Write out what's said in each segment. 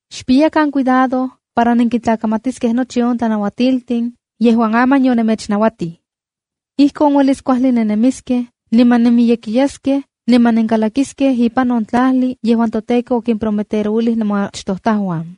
’Xpiyakan cuidado para nenkintlakamatiskej nochi on tlanauatiltin yejuan aman yonemechnauatij. Ijkon uelis kuajli nennemiskej, niman nenmiyekiyaskej niman nenkalakiskej ipan on tlajli yejuan toTEKO okimprometerouilij nemoachtojtajuan.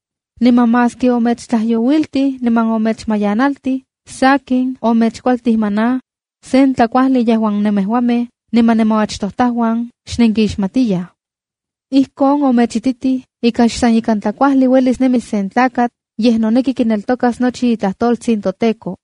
Niman maski omechtlajyouiltij niman omechmayanaltij, sakin omechkualtij maná, sen tlakuajli yejuan nemejuamej niman nemoachtojtajuan xnenkixmatiyaj. Ijkon omechititij ika xsan ikan tlakuajli uelis nemis sen tlakatl, yej noneki kineltokas nochi itlajtoltsin toTEKO.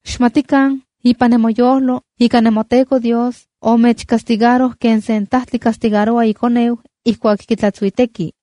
Xmatikan ipan nemoyojlo ika nemoTEKO Dios omechcastigaroj ken sen tajtli castigaroua ikoneu ijkuak kitlatsuiteki.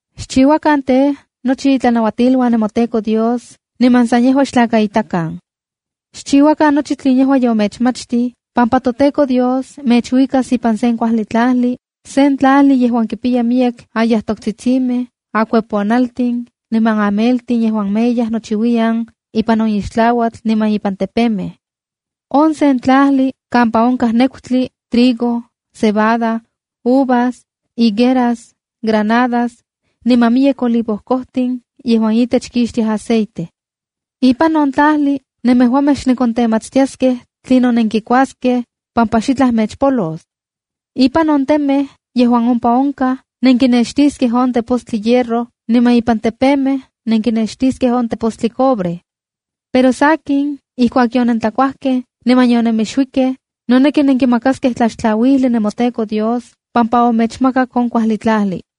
’Xchiuakan tej, nochi itlanauatiluan nemoTEKO Dios niman san yejua xtlakaitakan. Xchiuakan nochi tlen yejua yomechmachtij, pampa toTEKO Dios mechuikas ipan sen kuajli tlajli, sen tlajli yejuan kipiya miyek ayajtoktsitsimej, akueponaltin, niman ameltin yejuan meyaj nochiuiyan ipan on ixtlauatl niman ipan tepemej. On sen tlajli kampa onkaj nekutli, trigo, cebada, uvas, higueras, granadas niman miyek olivo kojtin yejuan itech kixtiaj aceite. Ipan on tlajli nemejuamej xnenkontenmatstiaskej tlinon nenkikuaskej, pampa xitlaj mechpolos. Ipan on temej yejuan ompa onkaj, nenkinextiskej on tepostli hierro, niman ipan tepemej nenkinextiskej on tepostli cobre. Pero sakin, ijkuak yonentlakuajkej niman yonemixuikej, noneki nenkimakaskej tlaxtlauili nemoTEKO Dios, pampa omechmakak on kuajli tlajli.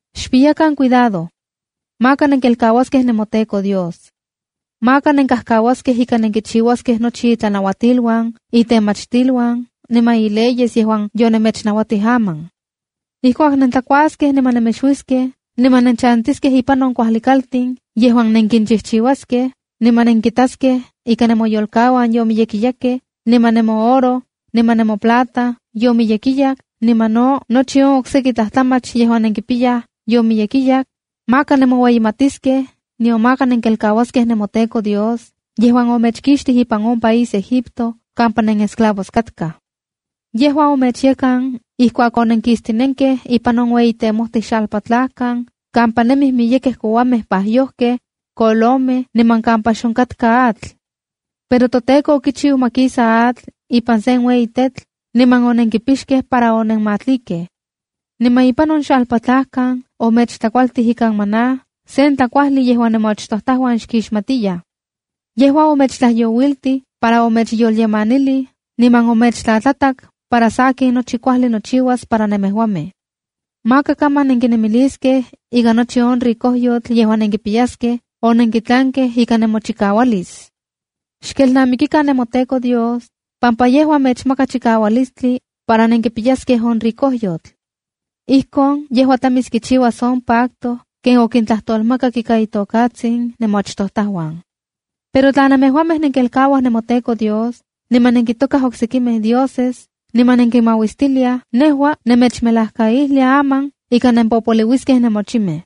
’Xpiyakan cuidado. Maka nenkelkauaskej nemoTEKO Dios. Maka nenkajkauaskej ika nenkichiuaskej nochi itlanauatiluan, itemachtiluan, niman ileyes yejuan yonemechnauatij aman. Ijkuak nentlakuaskej niman nemixuiskej, niman nenchantiskej ipan kuajli kaltin yejuan nenkinchijchiuaskej, niman nenkitaskej ika nemoyolkauan yomiyekiyakej, niman nemooro, niman nemoplata yomiyekiyak niman no nochi on okseki tlajtlamach yejuan nenkipiyaj yomiyekiyak, maka nemoueyimatiskej, nion maka nenkelkauaskej nemoTEKO Dios yejuan omechkixtij ipan on país Egipto kampa nenesclavos katkaj. Yejua omechyekan ijkuak onenkistinenkej ipan on ueyi temojtij xalpatlajkan kampa nemij miyekej kouamej pajyojkej, kolomej, niman kampa xonkatka atl. Pero toTEKO okichiu ma kisa atl ipan sen ueyi tetl niman onenkipixkej para onenmatlikej. Niman ipan on xalpatlajkan omechtlakualtij ikan maná, sen tlakuajli yejuan nemoachtojtajuan xkixmatiyaj. Yejua omechtlajyouiltij para omechyolyemanilij niman omechtlatlatak para sakin nochi kuajli nochiuas para nemejuamej. ’Maka kaman nenkinemiliskej ika nochi on ricojyotl yejuan nenkipiyaskej, onenkitlankej ika nemochikaualis. Xkelnamikikan nemoTEKO Dios, pampa yejua mechmaka chikaualistli, para nenkipiyaskej on ricojyotl. Ijkon yejua tlamis kichiuas on pacto ken okintlajtolmakak ika itokatsin nemoachtojtajuan. ’Pero tla nemejuamej nenkelkauaj nemoTEKO Dios, niman nenkintokaj oksekimej dioses, niman nekinmauistiliaj, nejua nemechmelajkaijlia aman ika nenpopoliuiskej nemochimej.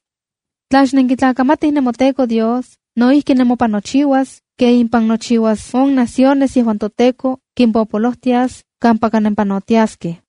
Tla xnenkitlakamatij nemoTEKO Dios, no ijki nemopan nochiuas ken impan nochiuas on naciones yejuan toTEKO kimpopolojtias kampaka nempanotiaskej.